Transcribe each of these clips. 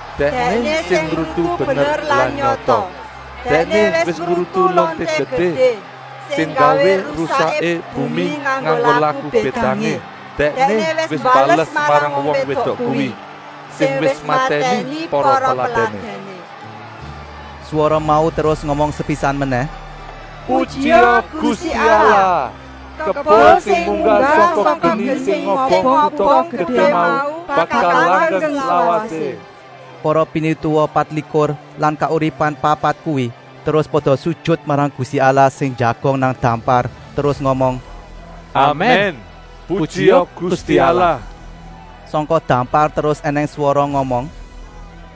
Dèkné sing ngrutu bener lan nyata. Dèkné wis ngrutu lonté gedé, sing nggawé rusaké bumi nganggo laku bédangé. Dèkné wis mbales marang wong wédok kuwi, sing wis matèni para peladèné.” Swara mau terus ngomong sepisan menèh: “Pujia Gusti Allah! Kebul sing munggah sangka geni sing ngobong kuta gedé mau bakal langgeng slawasé!” Para pinituwa patlikur lan kauripan papat kuwi terus pada sujut marang Gusti Allah sing njagong nang dampar terus ngomong: “Amèn, pujia Gusti Allah!” Sangka dampar terus ènèng swara ngomong: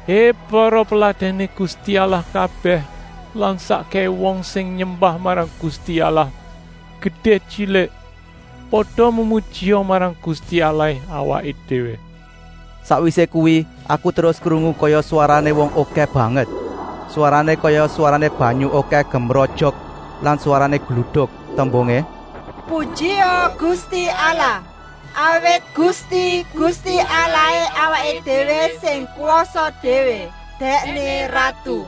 “Hé para peladèné Gusti Allah kabèh lan sakkèhé wong sing nyembah marang Gusti Allah, gedé-tyilik, pada memujia marang Gusti Allahé awaké déwé!” Sakwisé kuwi aku terus krungu kaya swarané wong okèh banget. Swarané kaya swarané banyu okèh gemrojok lan swarané gluduk, tembungé: “Pujia Gusti Allah! Awit Gusti, Gusti Allahé awaké déwé sing kwasa déwé, Dèkné Ratu.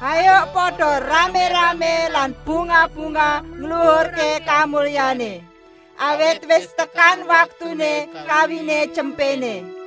Hayuk pada ramé-ramé lan bungah-bungah ngluhurké kamulyané. Awit wis tekan waktuné kawiné Tyempéné.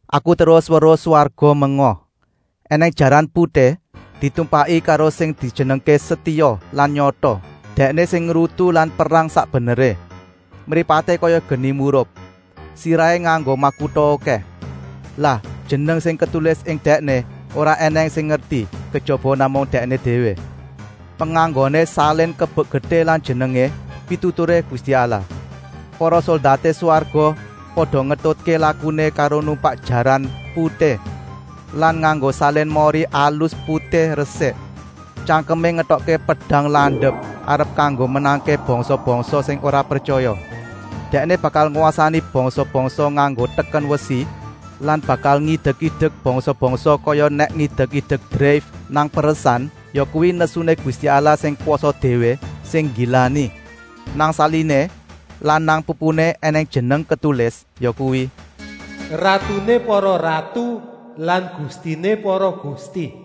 Aku terus weruh swarga menga. Enèng jaran putih, ditumpaki karo sing dijenengké Setia lan Nyata. Dèkné sing ngrutu lan perang sak beneré. Mripaté kaya geni murup. Sirahé nganggo makuta okèh. Lah jeneng sing ketulis ing Dèkné ora ènèng sing ngerti, kejaba namung Dèkné déwé. Penganggoné salin kebek getih lan jenengé: Pituturé Gusti Allah. Para soldaté swarga pada ngetutké lakuné karo numpak jaran putih lan nganggo salin mori alus putih resik. Tyangkemé ngetokké pedang landep arep kanggo menangké bangsa-bangsa sing ora pretyaya. Dèkné bakal ngwasani bangsa-bangsa nganggo teken wesi lan bakal ngidek-idek bangsa-bangsa kaya nèk ngidek-idek dreif nang peresan, yakuwi nesuné Gusti Allah sing kwasa déwé, sing nggilani. Nang saliné lan nang pupuné ènèng jeneng ketulis, yakuwi: Ratuné para ratu lan Gustiné para gusti.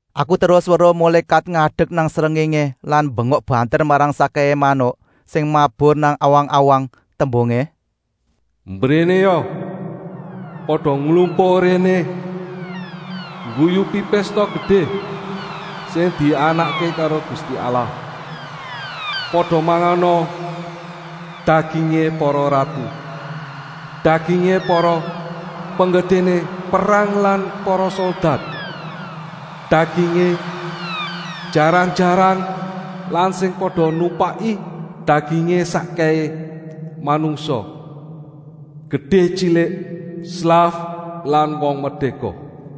Aku terus weruh mulékat ngadek nang srengéngé lan mbengok banter marang sakkèhé manuk sing mabur nang awang-awang, tembungé: “Mbrénéa, pada nglumpuk réné ngguyupi pésta gedé, sing dianakké karo Gusti Allah. Pada mangana dagingé para ratu, dagingé para penggedéné perang lan para soldat, dagingé jaran-jaran lan sing pada numpaki, dagingé sakkèhé manungsa, gedé-tyilik, slaf lan wong merdéka.”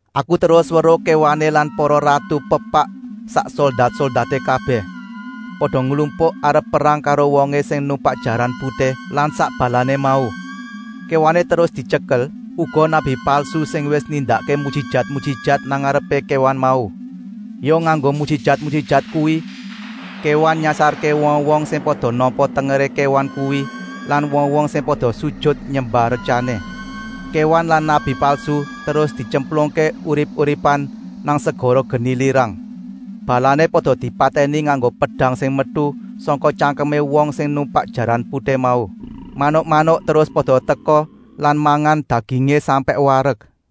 Aku terus weruh kéwané lan para ratu pepak sak soldat-soldaté kabèh, pada nglumpuk arep perang karo wongé sing numpak jaran putih lan sak balané mau. Kéwané terus dityekel, uga nabi palsu sing wis nindakké mujijat-mujijat nang ngarepé kéwan mau. Ya nganggo mujijat-mujijat kuwi kéwan nyasarké wong-wong sing pada nampa tengeré kéwan kuwi lan wong-wong sing pada sujut nyembah retyané. Kéwan lan nabi palsu terus dityemplungké urip-uripan nang segara geni lirang. Balané pada dipatèni nganggo pedang sing metu sangka tyangkemé wong sing numpak jaran putih mau. Manuk-manuk terus pada teka lan mangan dagingé sampèk warek.